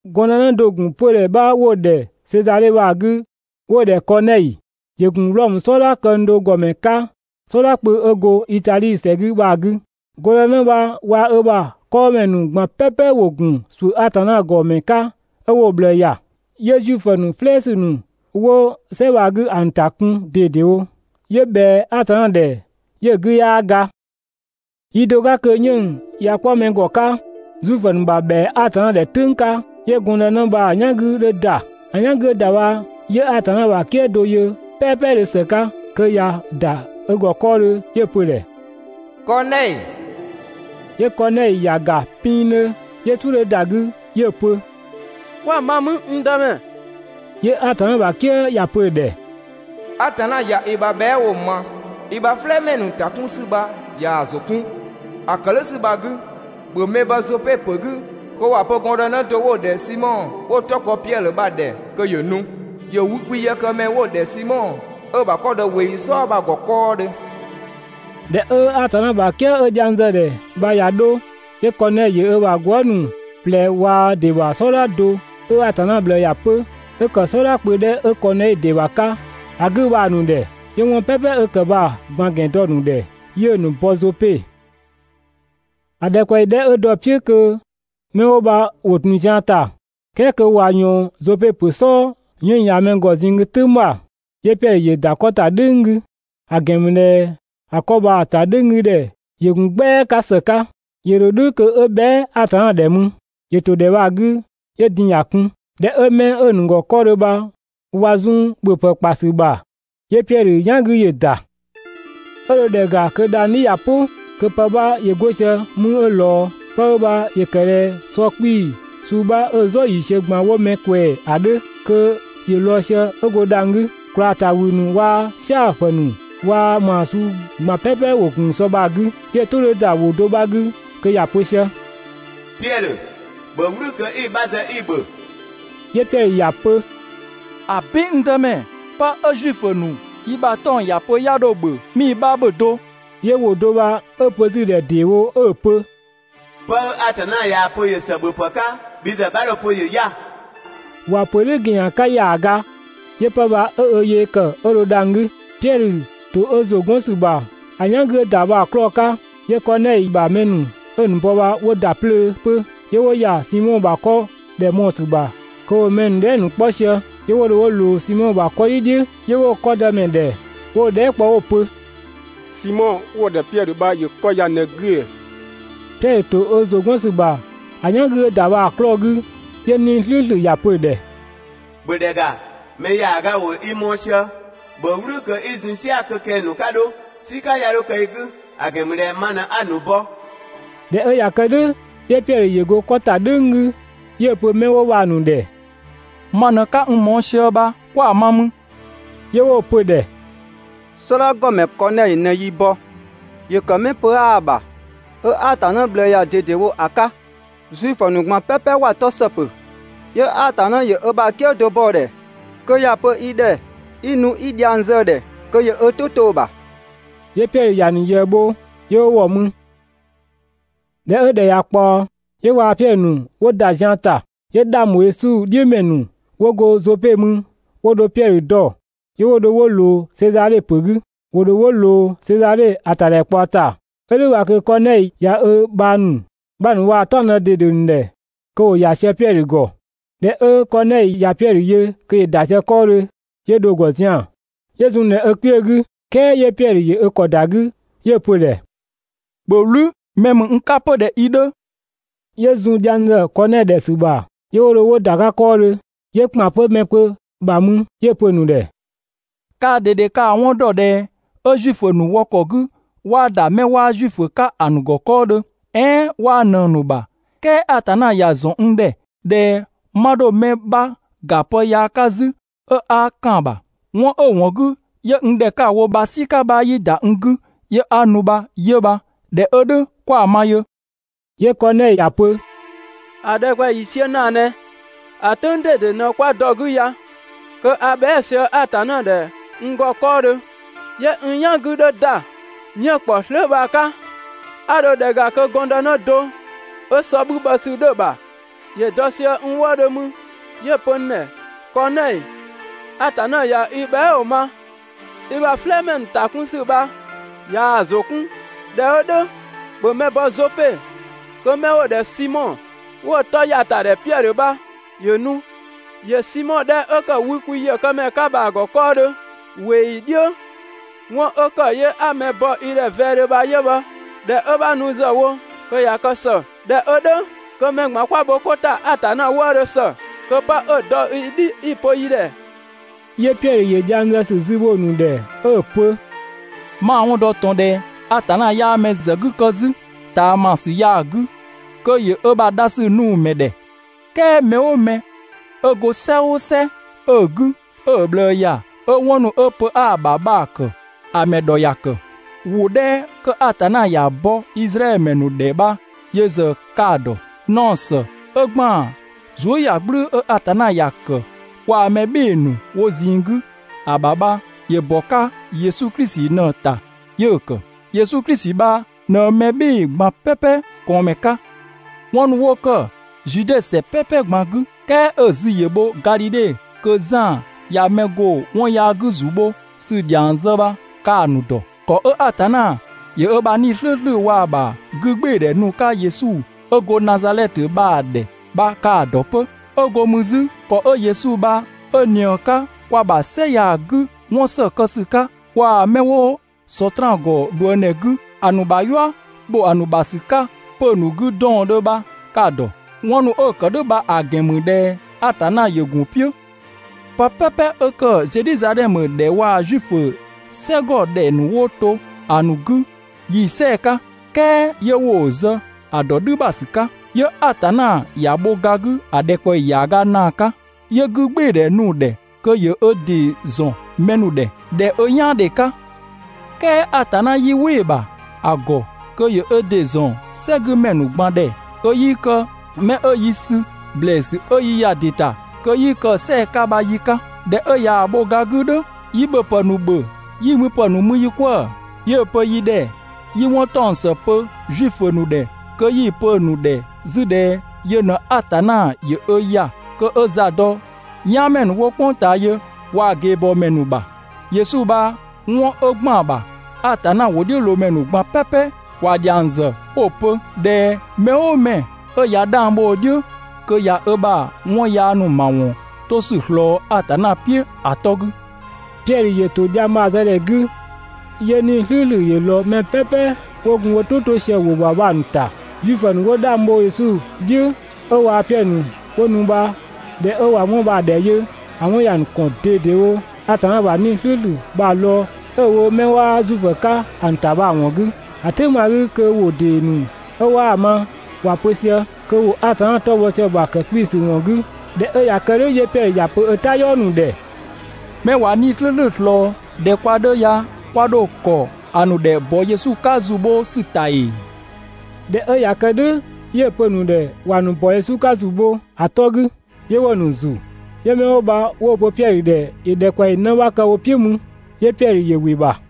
Gɔndënë do‑ ‑gun 'pödhɛ 'bha 'wo‑ ‑dhɛ Sezadhe bha‑ 'gü 'wo‑ ‑dhɛ Kɔɔnɛi, ‑yö ‑gun Wlɔmö "sɔdha këng do ‑gɔmɛ 'ka "sɔdha kpö 'ö go Itadhi ‑sɛ 'gü bha‑ 'gü. Gɔndënë bha waa‑ ö ‑bha 'kɔɔmɛ ‑nu ꞊gban "pɛpɛ ‑wo ‑gun ‑suʋ̈ Atanna ‑gɔ mɛ 'ka 'ö 'wo‑ ꞊bhlëë ‑ya, 'yö Zuifö "flɛɛsü ‑nu 'wo "sɛ bha‑ 'gü ‑a ‑nu ‑ta kun ꞊dedewo, 'yö ꞊bhɛa Atanna ‑dhɛ 'yö‑ 'gü 'yaa ga. Yi do 'ka kö 'yënng‑ ꞊ya 'kpɔ mɛ ‑gɔ 'ka, (Zuifö ‑nu ‑bha ‑bhɛa Atanna ‑dhɛ "tʋ̈ng 'ka), 'yö gɔndënë bha‑ "yan 'gü 'dhö ‑da. ‑A "yan 'gü 'ö ‑da bha 'yö Atanna ‑bha "kië do yö "pɛɛpɛdhö ‑së 'ka kö ꞊ya ‑da ö ‑gɔ 'kɔɔdhö 'yö‑ pö‑ ‑dhɛ: «Kɔɔnɛi!» 'Yö Kɔɔnɛi ‑ya ‑ga pinngdhö 'yö "suʋ̈ 'dhö ‑da 'gü 'yö‑ pö: «'Kwa ma 'mü, n Dëmɛ?» 'Yö Atanna ‑bha "kië ‑ya pö‑ ‑dhɛ: «Atanna ꞊ya i ‑bha bhɛa" ‑wʋ ma, i ‑bha "flɛɛmɛ ‑nu ‑ta 'kun ‑sü bha ꞊yaa‑ ‑zʋ 'kun. ‑A ‑kë "dhʋ̈ ‑sü bha‑ 'gü, ‑bhö mɛ bɔ Zope ‑pö 'gü kö ‑wa pö gɔndënë do 'wo‑ ‑dhɛ Simɔ 'wo‑ 'tɔ kpɔ Piɛdhö bha‑ ‑dhɛ kö ‑yö nu. ‑Yö wükwi ‑yëkëmɛ 'wo‑ ‑dhɛ Simɔ, 'ö‑ ‑bha 'kɔ‑ dɔ ꞊weeyi "sɔɔ bha‑ ‑gɔ 'kɔɔdhö.» ꞊Dhɛ 'ö Atanna ‑bha "kië 'ö dhiang zë‑ ‑dhɛ bha ꞊ya 'dho, 'yö Kɔɔnɛi ‑yö ö ‑bha gwëëzë ‑nu ꞊plɛ waa‑ ‑dɩ ‑bha "sɔdha do 'ö Atanna ꞊bhlëë ‑ya 'pö, 'ö ‑kë "sɔdha kpö 'dhɛ 'ö Kɔɔnɛi ‑dɩ ‑bha 'ka ‑a 'gü bha‑ ‑nu ‑dhɛ. 'Yö 'wɔn "pɛpɛ 'ö ‑kë bha‑ ꞊gban ‑gɛn dɔ‑ ‑nu ‑dhɛ, 'yö‑ ‑nu bɔ Zope. ‑A ‑dhɛkpaɔyi 'dhɛ 'ö dɔ‑ "piʋ̈ kö 'mɛ 'wo bha ‑wo ‑tun zian ‑ta, "kɛɛ kö ꞊wa ꞊yɔɔn Zope ‑pö "sɔɔ 'yënng‑ ‑ya mɛ ‑gɔ ꞊zinng 'gü "tʋ̈ng ‑bha, 'yö Piɛdhö ‑yö ‑da 'kɔ ‑ta "dhʋ̈ng 'gü, (‑a ‑gɛn ‑mü ꞊dhɛ ‑a 'kɔ bha‑ ‑ta "dhʋ̈ng 'gü ‑dhɛ ‑yö ‑gun "gbɛa 'ka ‑së 'ka). ‑Yö ‑dho "dhʋ̈ kö 'ö bhɛa" Atanna ‑dhɛ mü. ‑Yö ‑to ‑dhɛ bha‑ 'gü 'yö din‑ ‑ya kun. ꞊Dhɛ 'ö 'mɛ 'ö‑ ‑nu ‑gɔ 'kɔɔdhö bha ꞊wa zun‑ ‑bhö pë ‑kpa ‑sü ‑bha, 'yö Piɛdhö "yan 'gü ‑yö ‑da. 'Ö dho ‑dhɛ ‑ga kö dhang‑ "dhi ꞊ya "pʋ, kö pë 'bha ‑yö 'go sië 'mü 'ö ꞊lɔɔ. 'Pë 'ö bha ‑yö ‑kë ꞊dhɛ sɔ 'kpii‑ suu 'bha 'ö‑ "zɔ ‑yiisiö ꞊gban 'wo mɛ ꞊kwɛɛ‑ ‑a 'dhö, kö ‑yö lɔɔ‑ sië 'ö go dhang‑ 'gü. ꞊Kwlaa ‑ta ‑wü ‑nu waa‑ "siapë ‑nu waa‑ ‑maa suu ꞊gban "pɛpɛ ‑wo ‑gun sɔ bha‑ 'gü, 'Yö‑ "tʋ 'dhö ‑da ‑wʋ do bha 'gü kö ‑ya pö sië: «Piɛdhö, ‑bhö "wlü kö 'i‑ 'bha zë 'i‑ ‑bhö!» 'Yö Piɛdhö ‑ya pö: «‑Abin, n Dëmɛ! 'Pë 'ö Zuifö ‑nu yi ‑bha 'tɔng‑ ‑ya pö 'ya 'dho‑ ‑bhö 'mii‑ 'bha ‑bhö do!» 'Yö ‑wʋ do bha 'ö‑ pö 'zü‑ ‑dhɛ ‑deewo 'ö‑ pö: «'Pë 'ö Atanna ꞊yaa‑ pö ‑yö ‑së ‑bhöpë 'ka, bhi ‑zë 'bha 'dho‑ pö ‑yö 'ya‑!» ‑Wa ‑pö "dhʋ̈ ‑gɛnyan 'ka ‑yaaga, 'yö 'pë bha 'ö ö yee ‑kë 'ö dho dhang‑ 'gü. Piɛdhö ‑to ö ‑zʋ 'gɔn ‑sü ‑bha ‑a "yan 'gü 'ö ‑da bha‑ 'klɔɔ‑ 'ka, 'yö Kɔɔnɛi ‑bha 'mɛ 'ö‑ ‑nu bɔ bha 'wo ‑da 'plöö 'pö, 'yö 'wo ‑ya Simɔ ‑bha 'kɔ ‑dhɛ mɔɔ‑ ‑sü ‑bha kö ‑wo mɛ ‑nu dhɛɛ" ‑nu 'kpɔ sië. 'Yö 'wo dho 'wo ꞊loo Simɔ ‑bha 'kɔdhi "dhiʋ̈, 'yö 'wo‑ 'kɔ dëmɛ ‑dhɛ 'wo‑ dhɛɛ" kpɔ 'wo‑ pö: «Simɔ 'wo‑ ‑dhɛ Piɛdhö bha ‑yö 'kɔ ya ꞊në‑ 'gü ‑ee?» Piɛdhö ‑to ö ‑zʋ 'gɔn ‑sü ‑bha ‑a "yan 'gü 'ö ‑da bha‑ 'klɔɔ‑ 'gü, 'yö 'Nii‑ "slʋ̈ʋ̈slʋ̈ ‑ya pö‑ ‑dhɛ: «‑Bhö ‑dhɛ ‑ga, mɛ ‑yaaga ‑wo i mɔɔ‑ sië, ‑bhö "wlü kö 'i zun "sia‑ kö kɛng‑ ‑nu 'ka 'dho, "sika 'ya 'dho kë i 'gü, ‑a ‑gɛn ‑mü ꞊dhɛ ma ꞊në 'a‑ ‑nu bɔ!» ꞊Dhɛ 'ö ꞊ya kë "dhʋ̈, 'yö Piɛdhö ‑yö go 'kɔ ‑ta "dhʋ̈ng 'gü, 'yö‑ pö 'mɛ 'wo bha‑ ‑nu ‑dhɛ: «Ma ꞊në 'ka n mɔɔ‑ sië bha, 'kwa ma mü?» 'Yö 'wo‑ pö‑ ‑dhɛ: «"Sɔdha ‑gɔmɛ Kɔɔnɛi ꞊në yi bɔ, ‑yö ‑kë 'mɛ 'ö pö 'aa‑ ‑bha, 'ö Atanna ꞊bhlëë ‑ya ꞊dedewo ‑a 'ka, Zuifö ‑nu ꞊gban "pɛpɛ ‑wa 'tɔ ‑së pö. 'Yö Atanna ‑yö ö ‑bha "kië do bɔ‑ ‑dhɛ kö ‑ya pö i ‑dhɛ kö 'i nu 'i dhiang zë‑ ‑dhɛ kö ‑yö ö "tʋ 'to‑ ‑bha.» 'Yö Piɛdhö ‑ya ‑nu ꞊yëë bho 'yö 'wo ‑wɔ mü. ꞊Dhɛ 'ö ‑dhɛ ꞊ya ꞊kpaɔ, 'yö waa‑ Piɛdhö ‑nu 'wo ‑da zian ‑ta. 'Yö 'dhang ‑bho Yesu "dhiʋ̈ ‑mɛ ‑nu 'wo go Zope mü 'wo dho Piɛdhö dɔ, 'yö 'wo dho 'wo ꞊loo Sezadhe ‑pö 'gü. 'Wo dho ‑wo ‑loo Sezadhe ‑a ‑tadhɛkpaɔ ‑ta. 'Ö "dhʋ̈ bha kö Kɔɔnɛi ꞊ya ö dëbhang ‑nu 'bha ‑nu waa‑ "taɔngdë ꞊dede ‑nu ‑dhɛ kö ‑wo ‑ya sië Piɛdhö ‑gɔ. ꞊Dhɛ 'ö Kɔɔnɛi ꞊ya Piɛdhö yö kö ‑yö ‑da sië 'kɔɔdhö, 'yö dho‑ ‑gɔ zian‑, 'yö "gblëënu‑ ꞊wlöö. "Kɛɛ 'yö Piɛdhö ‑yö ö ‑kɔ ‑da 'gü, 'yö‑ pö‑ ‑dhɛ: «‑Bhö "wlü, mɛ ‑mü n 'ka 'pö ꞊dhɛ i 'dhö!» 'Yö zun dhiang ‑zë Kɔɔnɛi ‑dhɛ ‑sü ‑bha 'yö 'wo dho 'wo ‑da 'ka 'kɔɔdhö, 'yö ‑kpan 'pö mɛ kpö ‑bha mü 'yö‑ pö‑ ‑nu ‑dhɛ: «Kaa ꞊dede ka‑ 'wɔn ‑dɔ ꞊dhɛ 'ö Zuifö ‑nu wɔ ‑kɔ 'gü 'waa ‑da 'mɛ 'waa Zuifö 'ka‑ ‑nu ‑gɔ 'kɔɔdhö, "ɛɛn 'waa ꞊nëng‑ ‑nu ‑bha, "kɛɛ Atanna ‑ya ‑zɔn n ‑dhɛ ꞊dhɛ 'ma 'dho mɛ 'bha ‑ga pë yaa 'ka 'zü 'ö 'a ‑kan ‑bha. 'Wɔn 'ö‑ ‑wɔn 'gü 'yö n ‑dhɛ 'ka‑ wo bha "sika bha 'yii ‑da n 'gü 'yö 'a nu bha 'yö bha. ꞊Dhɛ 'ö "dhʋ̈ 'kwa‑ ma yö?» 'Yö Kɔɔnɛi ‑ya pö: «‑A ‑dhɛkpaɔyi ‑yiisiö ‑naa ꞊nɛ, ‑a "tʋ̈ng ꞊dede ꞊në 'kwa dɔ‑ 'gü ya, kö a bhɛa" sië Atanna ‑dhɛ n ‑gɔ 'kɔɔdhö, 'yö n "yan 'gü 'dhö ‑da 'yënng‑ ‑kpɔ slöö' bha‑ 'ka, 'a dho ‑dhɛ ‑ga kö gɔndënë do 'ö sɔ 'bhü bhɔ ‑sü 'dhö‑ ‑bha ‑yö dɔ sië n wëëdhö mü 'yö‑ pö n ‑dhɛ: «Kɔɔnɛi, Atanna ꞊ya i bhɛa" ‑wʋ ma, i ‑bha "flɛɛmɛ ‑nu ‑ta 'kun ‑sü bha ꞊yaa‑ ‑zʋ 'kun. ꞊Dhɛ 'ö "dhʋ̈, ‑bhö mɛ bɔ Zope kö 'mɛ 'wo‑ ‑dhɛ Simɔ 'wo‑ 'tɔ ‑ya ‑ta ‑dhɛ Piɛdhö bha ‑yö nu. ‑Yö Simɔ 'dhɛ 'ö ‑kë wükwi ‑yëkëmɛ 'ka bha‑ ‑gɔ 'kɔɔdhö ꞊weeyi "dhiʋ̈.» 'Wɔn 'ö ‑kë 'yö 'a mɛ bɔ i ‑dhɛ vɛɛdhö bha 'yö bha. ꞊Dhɛ 'ö 'bha nu ‑zë wo kö ꞊ya kë ‑së. ꞊Dhɛ 'ö "dhʋ̈ kö mɛ ꞊gban 'kwa bho 'ko ‑ta Atanna wëëdhö ‑së kö 'pë 'ö‑ dɔ i "dhi 'i‑ pö yi ‑dhɛ.» 'Yö Piɛdhö ‑yö dhiang zë ‑sü zü bho‑ ‑nu ‑dhɛ 'ö‑ pö: «'Ma‑ 'wɔn dɔ ꞊tɔn ꞊dhɛ Atanna 'yaa mɛ ‑zë 'gü kë 'zü ꞊taamasü ya‑ 'gü kö ‑yö ö ‑bha dhasü nu‑ ‑mɛ ‑dhɛ. "Kɛɛ mɛ "ʋʋ mɛ 'ö go "sɛ "ʋʋ "sɛ 'ö‑ 'gü 'ö‑ ꞊bhlëë ‑ya, 'ö 'wɔn ‑nu 'ö pö 'aa‑ ‑bha ‑a ‑kë, ‑a ‑mɛ ‑dhɔ ‑ya ‑kë. ‑Wʋ 'dhɛ 'kö Atanna ‑ya bɔ Izraɛdhö ‑mɛ ‑nu ‑dhɛ bha yö ‑zë ka‑ ‑dɔ. Naɔ ‑së 'ö ‑gban zuëyagblʋ̈ʋ̈‑ 'ö Atanna ‑ya kë waa‑ mɛ "bhɩɩ‑ ‑nu wo ꞊zinng 'gü ‑a ‑bha bha ‑yö ‑bɔ 'ka Yesu Klisi ꞊në‑ ‑ta 'yö‑ ‑kë. Yesu Klisi bha ꞊në mɛ "bhɩɩ‑ ꞊gban "pɛpɛ ꞊kɔɔnmɛ 'ka. 'Wɔn ‑nu 'wo ‑kë Zude ‑sɛ "pɛpɛ ꞊gban 'gü, "kɛɛ 'ö‑ zü ‑yö bho Gadhidhe kö Zan ꞊ya mɛ ‑go 'wɔn yaa 'gü ‑zu bho ‑sü ‑dhiang zë bha ka‑ ‑nu ‑dɔ. ‑Kɔ 'ö Atanna ‑yö ö ‑bha 'Nii‑ "slʋ̈ʋ̈slʋ̈ waa‑ ‑bha 'gügbɩɩdhɛ nu‑ 'ka Yesu 'ö go Nazadhɛtö bha‑ ‑dhɛ bha ka‑ ‑dɔ 'pö. 'Ö go mü 'zü ‑kɔ 'ö Yesu bha 'ö ꞊nië‑ 'ka kwa ‑bha "sɛ ya‑ 'gü 'wɔn ‑së kë ‑sü waa‑ 'mɛ 'wo Sɔtraan ‑gɔ ꞊dhuëngdhɛ 'gü ‑a ‑nu ‑bha "yua ‑bho ‑a ‑nu ‑bha ‑sü ‑nu 'ka 'pö‑ ‑nu 'gü 'dɔɔndhö bha ka‑ ‑dɔ! 'Wɔn ‑nu 'ö‑ ‑kë "dhʋ̈ bha‑ ‑gɛn ‑mü ꞊dhɛ Atanna ‑yö ‑gun "piʋ̈. Pë "pɛpɛ 'ö‑ ‑kë Zedhizadhɛmö ‑dhɛ waa‑ Zuifö "sɛgɔ 'dhɛ ‑nu 'wo to ‑a ‑nu 'gü, yi‑ "sɛɛ‑ 'ka, "kɛɛ 'yö 'wo‑ zë ‑a ‑dɔ "dhü ‑bha ‑sü 'ka. 'Yö Atanna ‑ya bho ga 'gü ‑a ‑dhɛkpaɔyi ‑yaaga ‑naa 'ka, 'yö 'gügbɩɩdhɛ nu‑ ‑dhɛ kö ‑yö ö ‑dɩ ‑zɔn mɛ ‑nu ‑dhɛ ꞊dhɛ ö "yaandhe 'ka, "kɛɛ Atanna 'yii "wɩ‑ ‑bha ‑a ‑gɔ kö ‑yö ö ‑dɩ ‑zɔn "sɛgümɛ ‑nu ꞊gban ‑dhɛ kö 'yii kë 'mɛ 'ö yi sü ‑blɛɛsü 'ö yi ‑ya ‑dɩ ‑ta kö 'yi kë‑ "sɛɛ‑ 'ka bha yi 'ka. ꞊Dhɛ 'ö ꞊yaa‑ bho ga 'gü "dhʋ̈, yi ‑bhöpë ‑nu ‑bhö 'yi müpë ‑nu mü yi 'kwëë‑. 'Yö‑ pö yi ‑dhɛ 'yi 'wɔn ‑taɔng ‑së pö Zuifö ‑nu ‑dhɛ kö 'yi‑ pö‑ ‑nu ‑dhɛ 'zü ꞊dhɛ yö ꞊në Atanna ‑yö ö ‑ya kö 'ö za dɔ "yaanmɛ ‑nu 'wo "kpʋng ꞊taa yö waa‑ ꞊geebɔɔmɛ ‑nu ‑bha. Yesu bha 'wɔn 'ö ‑gban ‑bha, Atanna ‑wʋdhiʋ̈loomɛ ‑nu ꞊gban "pɛpɛ ‑wa ‑dhiang ‑zë 'wo‑ pö ꞊dhɛ, mɛ "ʋʋ 'mɛ 'ö ꞊ya 'dhang bho‑ "dhiʋ̈, kö ꞊ya ö ‑bha 'wɔn yaa ‑nu ‑mawɔn 'to ‑sü ꞊slɔɔ Atanna "piʋ̈ ‑a 'tɔ 'gü.» Piɛdhö ‑yö ‑to dhiang bha‑ zë ‑dhɛ 'gü, 'yö 'Nii‑ "slʋ̈ʋ̈slʋ̈ ‑yö ꞊lɔɔ mɛ "pɛpɛ 'wo gun wo "tʋ to sië‑ ‑wʋ ‑bha bha‑ ‑nu ‑ta. Zuifö ‑nu 'wo 'dhang bho Yesu "dhiʋ̈ 'ö waa Piɛdhö ‑nu 'wo nu bha ꞊dhɛ 'ö ꞊wa 'wɔn bha‑ ‑dhɛ yö, ‑a 'wɔn ‑ya ‑nu kɔn ꞊dedewo Atanna ‑bha 'Nii‑ "slʋ̈ʋ̈slʋ̈ bha lɔɔ‑ 'ö‑ wo 'mɛ 'waa Zuifö 'ka‑ ‑nu ‑ta bha‑ ‑wɔn 'gü. ‑A "tʋ̈ng bha‑ 'gü kö ‑wʋ ‑dee ‑nu 'ö 'waa‑ ma ‑wa pö sië, kö ‑wo Atanna 'tɔ bhɔ sië‑ ‑bha ‑kë 'kpiisü ‑wɔn 'gü. ꞊Dhɛ 'ö ꞊ya kë "dhʋ̈ 'yö Piɛdhö ‑ya pö ö "tayɔɔ ‑nu ‑dhɛ: «'Mɛ ꞊wa 'Nii‑ "slʋ̈ʋ̈slʋ̈ ꞊slɔɔ ꞊dhɛ kwa 'dhö ya, kwa ‑dho ‑kɔ ‑a ‑nu ‑dhɛ ‑bɔ Yesu 'ka ‑zu bho ‑sü ‑ta ‑ee?» ꞊Dhɛ 'ö ꞊ya kë "dhʋ̈ 'yö‑ pö‑ ‑nu ‑dhɛ ‑wa ‑nu ‑bɔ Yesu 'ka ‑zu bho ‑a 'tɔ 'gü. 'Yö 'wo‑ ‑nu ‑zu. 'Yö 'mɛ 'wo bha 'wo‑ pö Piɛdhö ‑dhɛ ‑yö ‑dhɛkpaɔyi 'në 'bha kë wo "piʋ̈ mü, 'yö Piɛdhö ‑yö ‑wɩ ‑bha.